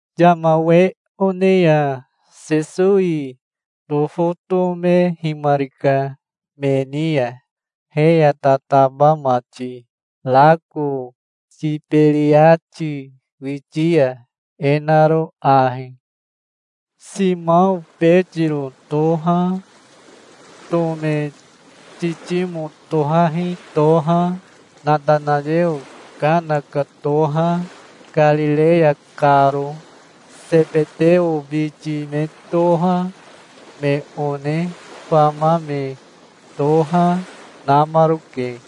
Yama we one ya Sesowi tofotomehimarika me ni ya, he ya tataba mati, rako Tiberiati witi ya, e naro ahi: Simao Betiro toha, Tome Titimo tohahi toha, Natanayeo Kana ka toha, Karireya karo, Sebeteo biti me toha, me one fama me toha, namaroke.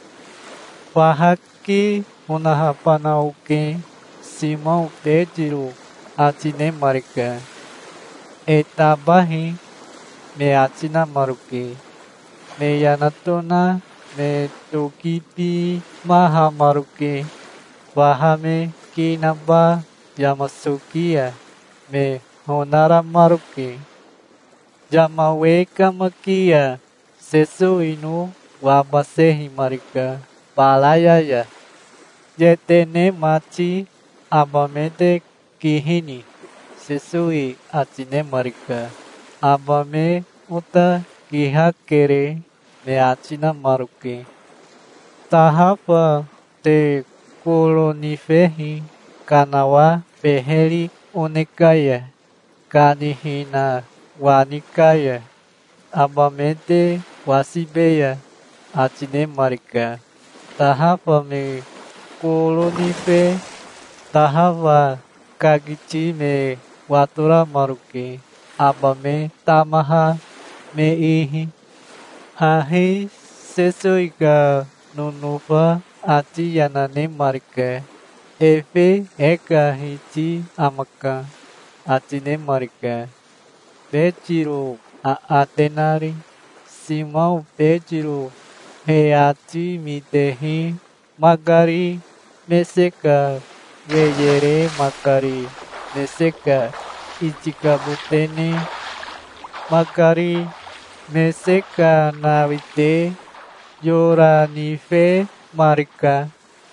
"Faha ki onahabana oke", Simao Betiro ati nemarika. "E tabahi", me ati namaroke. Me yana tona me tokibimahamaroke. Faha me ki naba yama soki ya me honaramaroke. Yama we kamaki ya Sesowino wabasehimarika baraya ya. "Yetene mati, aba me te kihini?" Sesowi ati nemarika. "Aba me ota kihakere", me ati namaroke. "Tahafa te koro nifehi kanawa beheri one ka ya, kanihina wani ka ya. Aba me te wasibeya", ati nemarika. Tahafa me koro nife tahafa kakiti me watoramaroke, aba me tamaha me ihi. Hahi Sesowi ka nonofa ati yana nemarika. "Efe e ka Hiti amaka", ati nemarika, Betiro aate nari. Simao Betiro he ati mitehi makari mese ka weye re makari mese ka itikabote ne makari mese ka nawite yora nifemarika.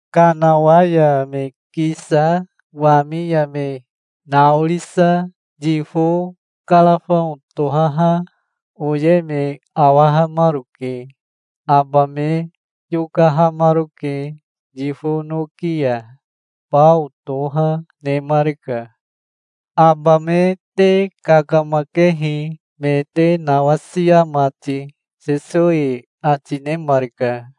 Kanawa ya me kisa wami ya me naorisa yifo karafao tohaha oye me awahamaroke. Aba me yokahamaroke yifo noki ya. Bao toha nemarika. "Aba me te kakamakehi, me te nawasia mati", Sesowi ati nemarika.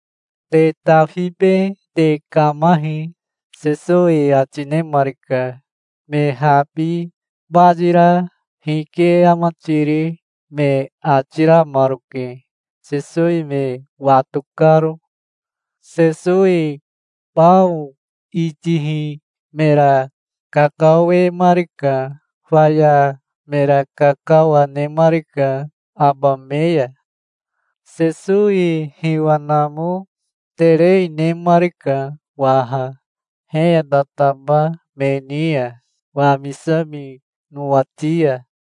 "Te tafibe te kamahi", Sesowi ati nemarika. Me habi bayira "Hike ama tiri", me ati ramaroke, Sesowi me wato karo. Sesowi bao itihi mera kakawemarika. Faya mera kakawa nemarika aba me ya. Sesowi hiwa namo terei nemarika waha, he ya tataba me ni ya, wamisami nowati ya.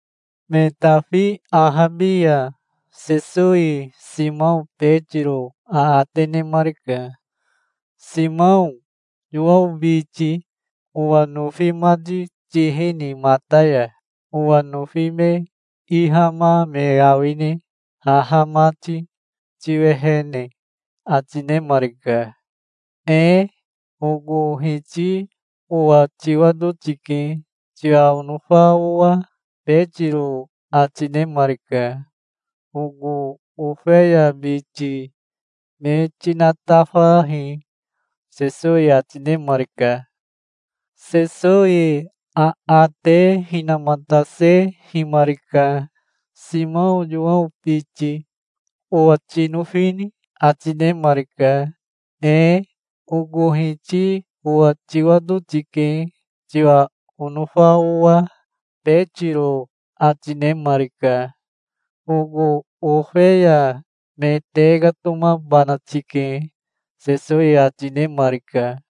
Me tafi ahabi ya Sesowi Simao Betiro aate nemarika. "Simao Yowao biti, owa nofi mati tihini mata ya? Owa nofi me ihama me awine, haha mati, tiwehene?" ati nemarika. "Ee oko Hiti owa tiwato tike, tiwa onofa owa", Betiro ati nemarika. "Oko ofeya biti me tinatafahi", Sesowi ati nemarika. Sesowi aate hinamatasehimarika. "Simao Yowao biti, owa tinofini?" ati nemarika. "Ee oko Hiti owa tiwato tike, tiwa onofa owa", Betiro ati nemarika. "Oko ofeya me tekatomabana tike", Sesowi ati nemarika.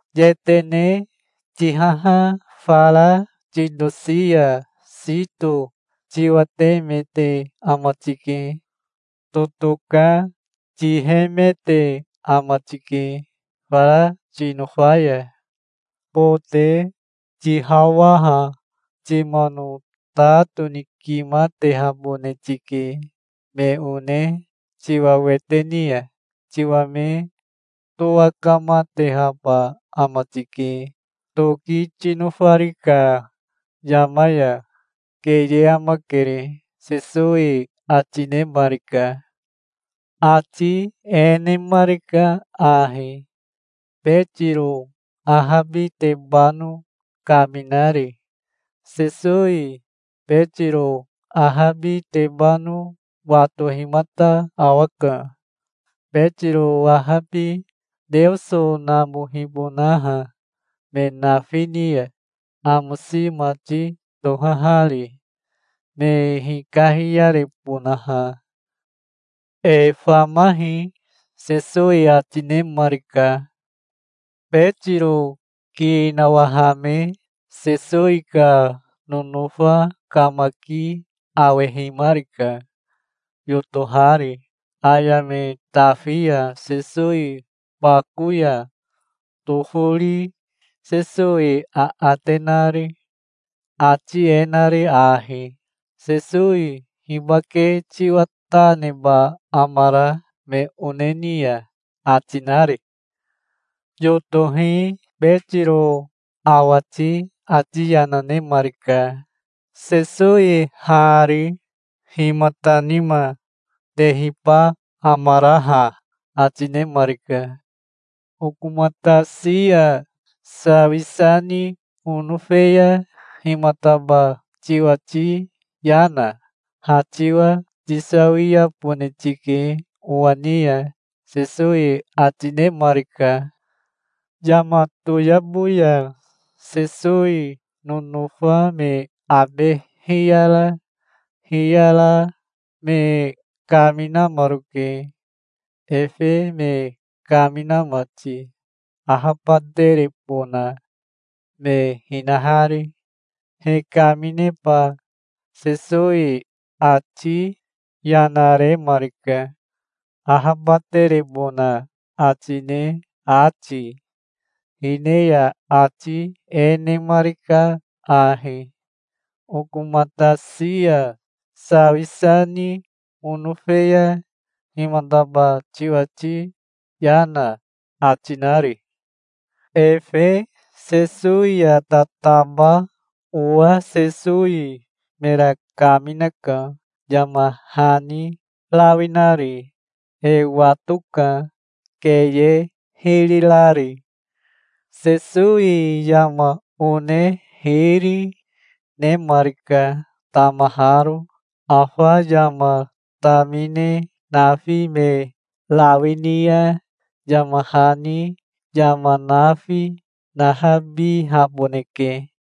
"Yetene tihaha fara titosi ya sito tiwatemete ama tike. Totoka tihemete ama tike fara tinofa ya. Bote tihawaha timano ta tonikimatehabone tike. Me one tiwa wete ni ya tiwa me towakamatehaba ama tike, toki tinofari ka yama ya. Keye amakere", Sesowi ati nemarika. Ati e nemarika ahi, Betiro ahabitebano kaminari. Sesowi Betiro ahabitebano watohimata awaka, Betiro ahabi Teoso namohibonaha me nafi ni ya, amosi mati tohahari, me hikahiyarebonaha. "E famahi", Sesowi ati nemarika. Betiro ki nawahame Sesowi ka nonofa kamaki awehimarika, yotohari, aya me tafi ya Sesowi bako ya tofori Sesowi aate nari, ati e nari ahi, "Sesowi hibake tiwa ta neba amara me one ni ya?" ati nari. Yotohi Betiro awati ati yana nemarika. "Sesowi hari, himata nima tehiba amara ha?" ati nemarika. "Okomatasi ya sawisa ni onofe ya himataba tiwati yana? Ha tiwa tisawiabone tike owa ni ya", Sesowi ati nemarika. Yama toyabo ya Sesowi nonofa me abe hiyara hiyara me kaminamaroke, efe me kamina mati, ahabaterebona me hinahari. He kamineba Sesowi ati yana remarika, ahabaterebona ati ne ati. Hine ya ati e nemarika ahi: "Okomatasi ya sawisa ni onofe ya himataba tiwati yana?" ati nari. Efe Sesowi ya tataba owa Sesowi mera kaminaka, yama hani rawi nari. E watoka, keye hiri rari. Sesowi yama one hiri, nemarika, tamaharo. Afa yama tamine nafi me rawi ni ya, yama hani yama nafi nahabihaboneke.